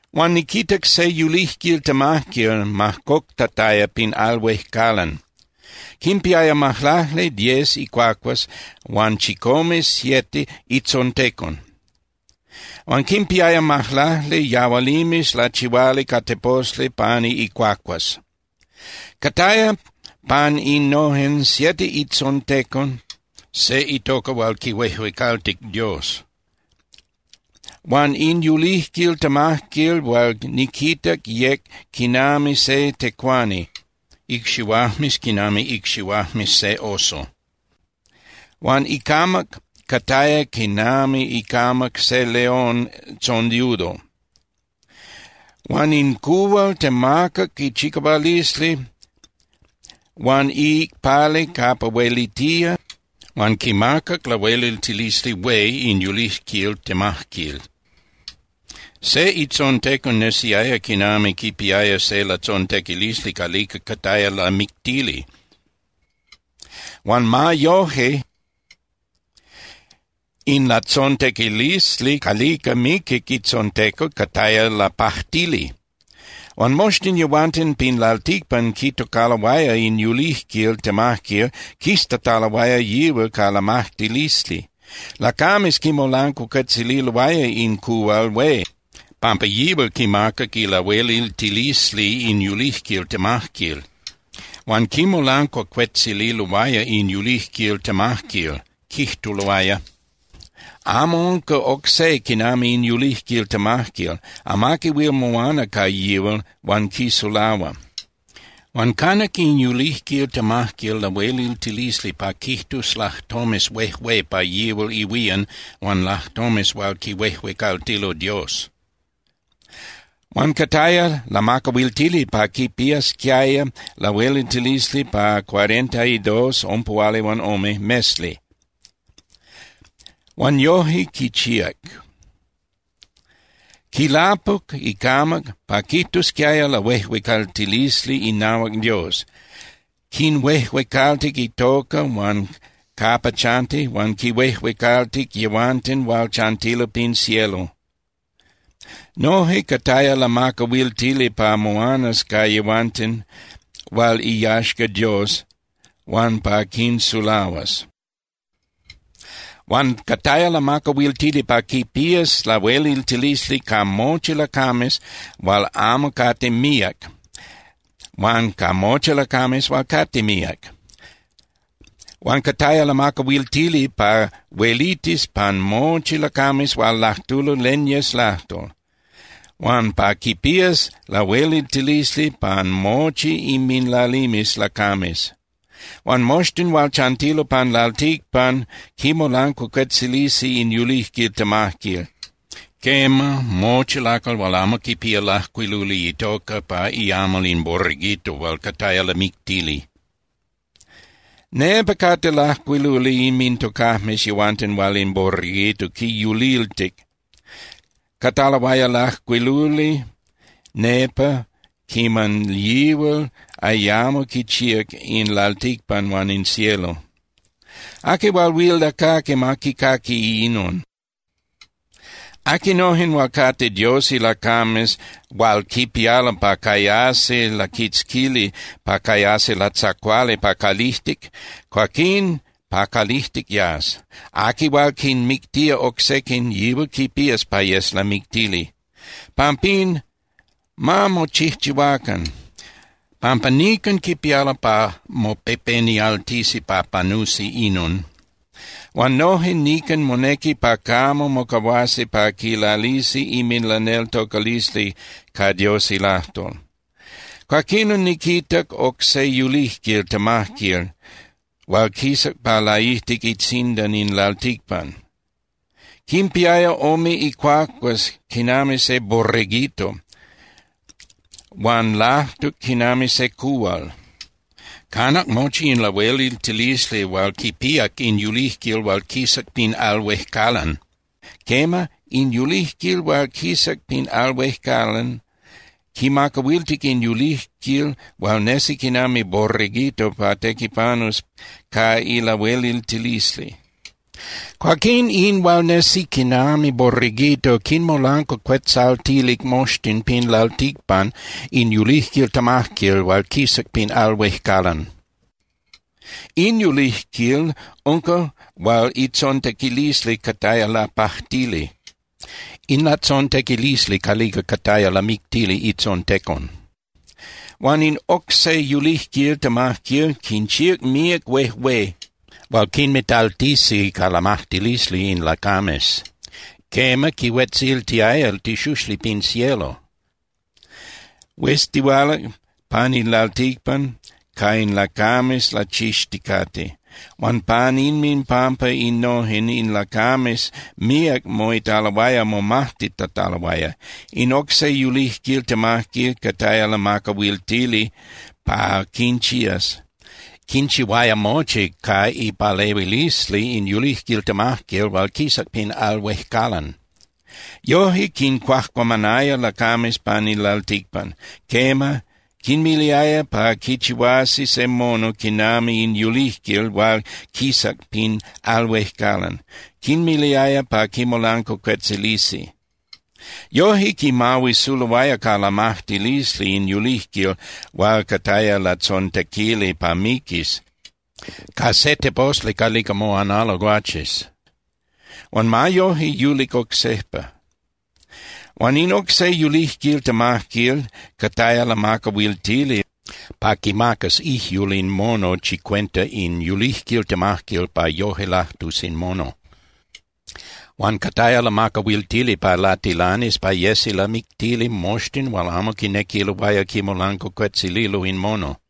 Huan niquitac se yulijquil temajquil majcoctataya pin al huejcalan. Quimpiaya majlacli (diez) icuacuas huan chicome (siete) itzontecon. Huan quinpiaya majlacli yahualimes lachihuali ca teposli pani icuacuas. Cataya pan innojen siete itzontecon se itoca hual quihuejuecaltic Dios. Huan in yulijquil temajquil hual niquitac yec quinami se tecuani, icxihuajmes quinami icxihuajmes se oso. Huan icamac cataya quinami icamac se león tzondiudo. Huan in cuhual temacac ichicahualisli huan iicpali capa huelitía huan quimacac lahueliltilisli hué in yulijquil temajquil. Se itzontecon nesiaya quinami quipiaya se latzontequilisli calica cataya lamictili, huan ma yoje, in latzontequilisli calica miquic itzontecon cataya lapajtili. Huan moxtin yehuanten pin lalticpan quitocaloaya in yulijquil temajquil quiztataloaya yihual ca lamajtilisli. Lacames quimolancuacuetzililoaya in cuhual hué pampa yihual quimacac ilahueliltilisli in yulijquil temajquil. Huan quimolancuacuetzililoaya in yulijquil temajquil, quijtuloaya: —Amo unca oc se quinami in yulijquil temajquil. Amaqui huil moana ca yihual huan quisulahua. Huan canac in yulijquil temajquil lahueliltilisli pa quijtus lajtomes huejué pa yihual ihuían huan lajtomes hual quihuejuecaltilo Dios. Huan cataya lamacahuiltili pa quipiasquiaya lahueliltilisli pa cuarenta y dos (ompuhualihuanome) mesli (meses). Huan yoje quichihuac. Quilapuc icamac pa quijtusquiaya lahuejuecaltilisli inahuac Dios, quinhuejuecaltic itoca huan capa chanti, huan quinhuejuecaltic yehuanten hual chantilo pin cielo. Noje cataya lamacahuiltili pa moanas ca yehuanten hual iyaxca Dios huan pa quinsulahuas. Huan cataya lamacahuiltili pa quipías lahueliltilisli ca mochi lacames hual amo cate míac huan ca mochi lacames hual cate míac. Huan cataya lamacahuiltili pa huelitis pan mochi lacames hual lajtulo len yes lajtol, huan pa quipías lahueliltilisli pan mochi inminlalimes lacames. Huan moxtin hual chantilo pan lalticpan quimolancuacuetzilisi in yulijquil temajquil, quema, mochi lacal hual amo quipía lajcuiluli itoca pa iamal in Borreguito hual cataya lamictili. Nepa cate lajcuiluli inmintocajmes yehuanten hual in Borreguito quinyuliltic. Cataloaya lajcuiluli nepa quiman yihual ayamo quichíac in lalticpan huan in cielo. Aqui hual huil lacaqui, ma quicaqui inon. Aquinojen hual cate Dios ilacames hual quipialo pa cayasi laquitzquili pa cayasi latzacuali pa calijtic, cuaquín pa calijtic yas. Aqui hual quinmictía oc sequin, yihual quipías pa yes lamictili. Pampín, ma mochijchihuacan, pampa nican quipialo pa mopepenialtisi pa panusi inon. Huan noje nican monequi pa camo mocahuasi pa quilalisi inminlaneltocalisli ca Dios ilajtol. Cuaquinon niquitac oc se yulijquil temajquil hual quisac pa laijtic itzindan in lalticpan. Quimpiaya ome icuacuas quinami se borreguito, huan lajtuc quinami se cuhual. Canac mochi in lahueliltilisli hual quipíac in yulijquil hual quisac pin al huejcalan. Quema, in yulijquil hual quisac pin al huejcalan quimacahuiltic in yulijquil hual nesi quinami borreguito pa tequipanus ca ilahueliltilisli. Cuaquín in hual nesi quinami borreguito quinmolancuacuetzaltilic moxtin pin lalticpan in yulijquil temajquil hual quisac pin al huejcalan. In yulijquil unca hual itzontequilisli cataya lapajtili, in latzontequilisli calica cataya lamictili itzontecon. Huan in oc se yulijquil temajquil quinchíac míac huejué hual quinmitaltisi ca lamajtilisli in lacames. Quema, quihuetziltiaya tixuxli pin cielo, hueztihualac pan in lalticpan ca in lacames lachixticate. Huan pan inminpampa innojen, in lacames míac moitaloaya momajtitataloaya. In oc se yulijquil temajquil cataya lamacahuitili pa quinchías. Quinchihuaya mochi ca ipalehuilisli in yulijquil temajquil hual quisac pin al huejcalan. Yoje quincuajcuamanaya lacames pan in lalticpan. Quema, quinmiliaya pa quichihuasi se mono quinami in yulijquil hual quisac pin al huejcalan, quinmiliaya pa quimolancuacuetzilisi. Yoje quimahuisuloaya ca lamajtilisli in yulijquil hual cataya latzontequili pa miquis ca se teposli calica moanalo guaches, huan ma yoje yulic oc sejpa. Huan in oc se yulijquil temajquil cataya lamacahuiltili pa quimacas ijyul in mono chicuenta in yulijquil temajquil pa yoje lajtus in mono. Huan cataya lamacahuiltili pa latilanis pa yesi lamictili moxtin hual amo quinequiloaya quimolancuacuetzililo in mono.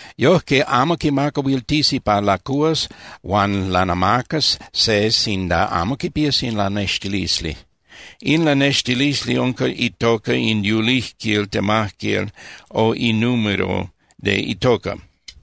Yojque amo quimacahuiltisi pa lacuhuas huan lanamacas se sinda amo quipías in lanextilisli. In lanextilisli unca itoca in yulijquil temajquil o inúmero de itoca.